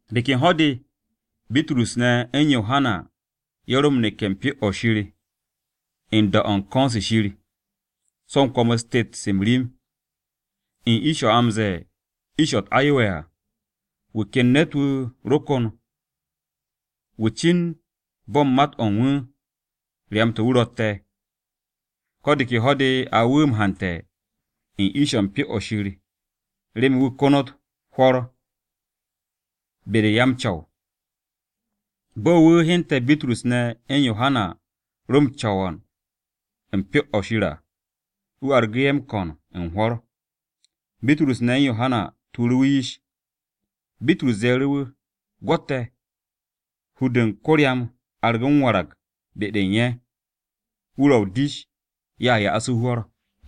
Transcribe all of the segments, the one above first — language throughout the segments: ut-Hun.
De ken ho̱-de Bitrus ne̱ u̱n Yohana ye̱ ro m-neke̱ u̱n Pyo-o̱ Shir u̱n da-o̱ u̱n ko̱n-se Shir, so̱ u̱n kwo̱m-u̱s tet-se m-rim. U̱n ish-o̱ a m-ze̱e̱ Ish-o̱ u̱t-Ayowe̱ à, wu̱ ken ne̱t-wu̱ ro kon wu̱ cin bo̱ u̱n mat-o̱ u̱n wu̱ ryam-to̱ wu̱ rotte̱. Ko̱ de ke ho̱-de a wu̱ m-hante̱ u̱n ish-o̱ u̱n Pyo-o̱ Shir, remen wu̱ konot hwo̱r be-de u̱n ya-m-co̱w. Bo̱ wu̱ hyente̱ Bitrus ne̱ u̱n Yohana ro m-co̱w u̱n Pyo-o̱ Shir à, wu̱ argu̱ ye̱ m-ko̱n u̱n hwo̱r. Bitrus ne̱ u̱n Yohana tuuru̱ wu̱ yish, Bitrus ze̱e̱ru̱ wu̱, “Gwo̱t te̱.” Hur-de u̱n ko-ryam argu̱ m-warag be-de u̱n ye̱, wu̱ ro o-dish ye̱a ya'as wu̱ hwo̱r.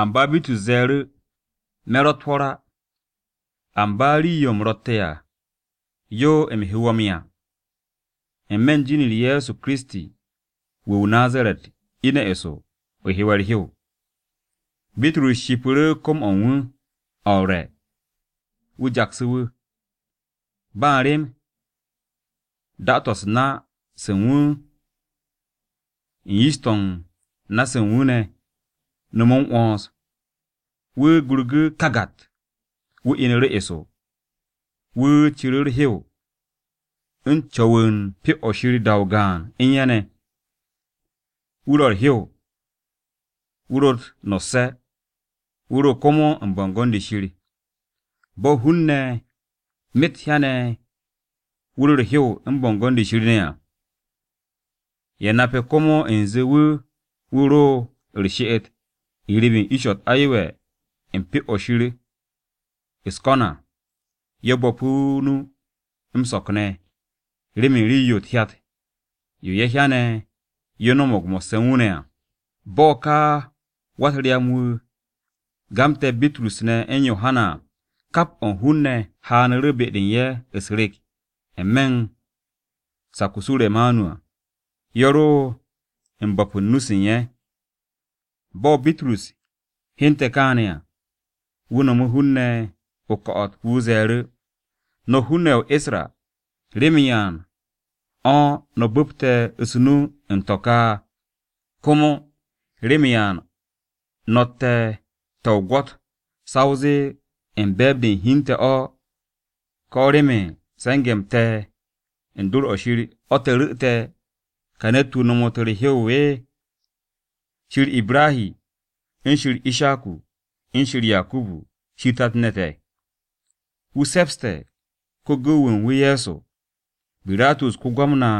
Amba Bitrus ze̱e̱ru̱, “Me̱ ro̱tt hwo̱r á. Amba rii-yo u̱m ro̱tte̱ à, yo u̱m he wo̱ m-'ya. N-me̱ jin-u̱r Ye̱so Kiristi wu̱ o-Nazaret, ine̱ eso, o hewe̱ u̱r-hew!” Bitrus shipu̱ru̱ kom-o̱ u̱n wu̱ o̱ u̱r-re̱, wu̱ jaksu̱ wu̱. Ba u̱n rem, da-to̱ u̱s-na se u̱n wu̱ u̱n yish-to̱ u̱n na-se u̱n wu̱ ne̱ no̱mu̱ m-'wo̱ns. Wu̱ gurgu̱ kagat! Wu̱ inu̱ru̱ eso, wu̱ ciru̱ u̱r-hew, u̱n co̱wu̱ u̱n Pyo-o̱ Shir da-o gaan u̱n ye̱ ne̱. Wu̱ ro u̱r-hew, wu̱ ro̱ u̱t-no̱sse̱, wu̱ ro̱ komo u̱n bo̱ngo̱n-de Shir. Bo̱ hun-ne̱ myet hyane̱ wu̱ ro̱ u̱r-hew u̱n bo̱ngo̱n-de Shir ne̱ à, ye̱ nape̱ komo u̱nze wu̱ wu̱ ro u̱r-she'et n-riib u̱n Ish-o̱ u̱t-Ayowe̱ u̱n Pyo-o̱ Shir u̱s-ko̱n à. Ye̱ bo̱pu̱ o-nu m-so̱k ne̱ remen rii-yo u̱t-hyat yo ye̱ hyane̱ yo no̱mo̱g mo̱sse̱ u̱n wu̱ ne̱ à. Bo̱ ka wa-u̱t-ryam-wu̱ gamte̱ Bitrus ne̱ u̱n Yohana à, kap o̱ u̱n hun-ne̱ haanu̱ru̱ be-de u̱n ye̱ u̱s-rek n-me̱ u̱n sak-o̱ Suremanu à, ye̱ ro̱ u̱n bo̱pu̱ u̱n nu-se u̱n ye̱. Bo̱ Bitrus hyente̱ kaane̱ à, wu̱ nomu̱ hun-ne̱ o-ko̱'o̱t. Wu̱ ze̱e̱ru̱, “No̱ hun-ne̱ ye̱ o-Isra, ¿remen ya u̱n o̱ no̱ bu̱pte̱ u̱s-nu u̱n to̱ ka? Komo ¿remen ya u̱n no̱tte̱ te̱ o-gwo̱t, sa o zee u̱n be̱e̱b-de u̱n hi u̱n te̱ o̱, ko̱ remen se̱nge̱-m te̱ be-de u̱n dor-o̱ Shir o̱ te̱ ru̱'u̱te̱ ka ne̱t-wu̱ hewu̱te̱ u̱r-hew? Shir Ibrahi, u̱n Ishaku, u̱n Yakubu ne̱, Shir tat-ne̱ te̱, wu̱ se̱pse̱ ko-gu̱w-wu̱ u̱n wu̱ Ye̱so. Biratus ko-Gwamna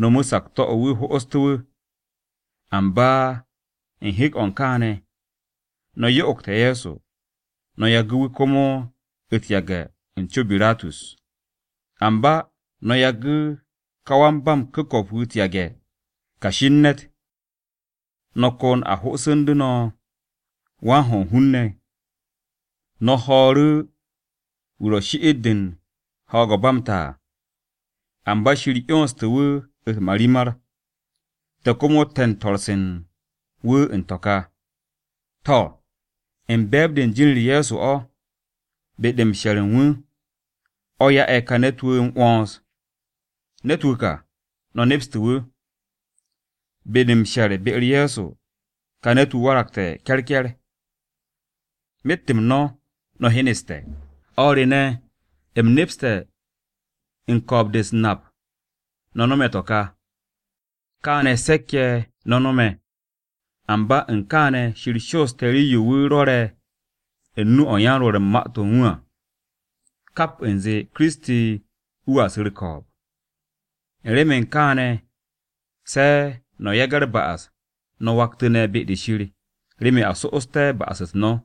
no̱mu̱ sakto̱-o̱ wu̱ ho'ostu̱ wu̱. Amba u̱n hek-o̱ u̱n kaane̱, no̱ yo'ogte̱ Ye̱so, no̱ yagu̱ wu̱ komo u̱t-yage̱ u̱n co Biratus. Amba no̱ yagu̱ ka wan-ba-m-ku̱ko̱p wu̱ u̱t-yage̱, Kashi u̱n Ne̱t, no̱ kon a ho'osu̱ndu̱ no̱ ka wan-ho̱ u̱n hun-ne̱ wu̱. No̱ ho̱o̱ru̱ wu̱ ro̱ shi'it-de u̱n ho̱o̱g-o̱ u̱n ba m-ta à. Amba Shir 'yonstu̱ wu̱ u̱t-marimar, te̱ komo te̱ u̱n swo̱-se u̱n wu̱ u̱n to̱ ka. To̱, u̱n be̱e̱b-de u̱n jin-u̱r Ye̱so o̱, be-de m-she̱r u̱n wu̱, o̱ ya'e̱ ka ne̱t-wu̱ m-'wo̱ns. Ne̱t-wu̱ ka, no̱ nepstu̱ wu̱. Be-de u̱n m-she̱r be-u̱r Ye̱so, ka ne̱t-wu̱ waragte̱ ke̱rke̱r. Myet-m no̱, no̱ hyeneste̱. “O̱r re ne̱, u̱m nepste̱ u̱n ko̱o̱b-de u̱s-nap no̱ no̱me̱ to̱ ka, kaane̱ se̱k-ye̱ no̱ no̱me̱. Amba u̱n kaane̱ Shir shooste̱ rii-yo wu̱ rwo̱re̱ u̱n nu-o̱ u̱n yan-rwo̱r u̱n ma-to̱ u̱n wu̱ à kap u̱nze, Kiristi, wu̱a su̱ u̱r-ko̱o̱b. U̱n remen kaane̱ se̱, no̱ yage̱ u̱r-ba'as, no̱ waktu̱ne̱ be-de Shir remen a so'osté̱ ba'as-u̱t no̱,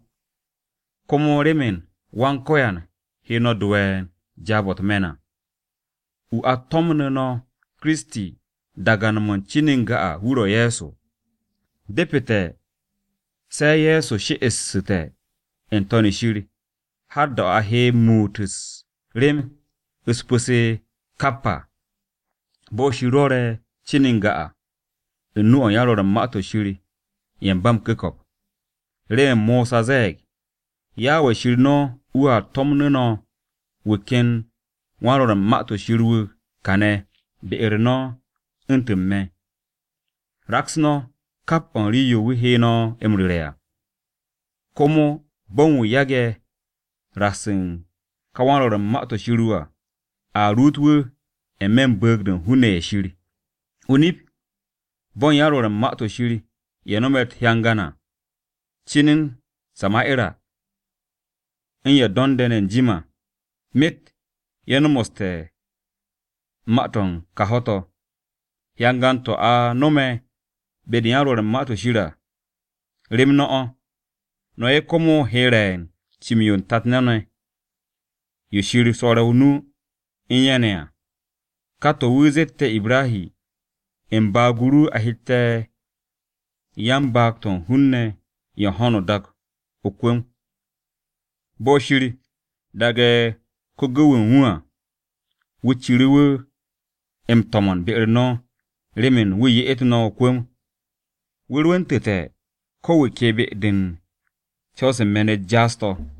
komo remen Wan-Ko̱yan wu̱ he no̱ do ye̱ u̱n jaab-o̱ u̱t-me̱n. Wu̱a tomon no̱ Kiristi dagan-mo̱ u̱n cin n-ga, wu̱ ro̱ Ye̱so. Depete̱ se̱ Ye̱so she'essu̱te̱ n-To̱n shir, har da-o̱ a he muut u̱s-rem u̱s-pu̱ se kap à, bo̱ Shir rwo̱re̱ cin u̱n n-ga à, u̱n nu-o̱ u̱n yan-rwo̱r u̱n Ma-to̱ Shir ye̱ u̱n ba m-ku̱ko̱p. Remen Mosa ze̱e̱g, ‘Yawe Shir no̱ wu̱a tomon no̱ wu̱ ken wan-rwo̱r u̱n Ma-to̱ Shir wu̱ kane̱ be-u̱r o̱r no̱, u̱ntu̱n me̱. Raks no̱ kap o̱ u̱n rii-yo wu̱ he no̱ m-ru̱re̱ à. Komo bo̱n wu̱ yage̱ raks u̱n ka wan-rwo̱r u̱n Ma-to̱ Shir wu̱ à, a ruut wu̱ n-me̱ u̱n bu̱u̱g-de u̱n hun-ne̱ ye̱ Shir.’ “O-nip, bo̱ u̱n yan-rwo̱r u̱n Ma-to̱ Shir ye̱ no̱me̱ u̱t-hyangan à, cin u̱n Sama'era, u̱n ye̱ do̱nde̱ ne̱ n-jim à, myet ye̱ nomoste̱ ma-to̱ u̱n kà ho̱-to̱. Hyangan-to̱ a no̱me̱ be-de u̱n yan-rwo̱r u̱n Ma-to̱ Shir à, rem no̱ o̱, no̱ ye̱ komo he re̱ u̱n cim-yo tat-ne̱ no̱, yo Shir swo̱re̱ o-nu u̱n ye̱ ne̱ à. Ká to̱ wu̱ zette̱ Ibrahi, ‘U̱n baag-o ru a hette̱ 'ya u̱n baag-to̱ u̱n hun-ne̱ ye̱ u̱n ho̱no o-dak o-kwu̱m.’ Bo̱ Shir daage̱ ko-gu̱w-wu̱ u̱n wu̱ à, wu̱ ciru̱ wu̱ m-to̱mo̱n be-u̱r no̱ remen wu̱ ye'et no̱ o-kwu̱m, wu̱ rwu̱ntu̱te̱ ko̱ wu̱ ke be-de u̱n co̱w-se u̱n me̱n-u̱t jaas-to̱.”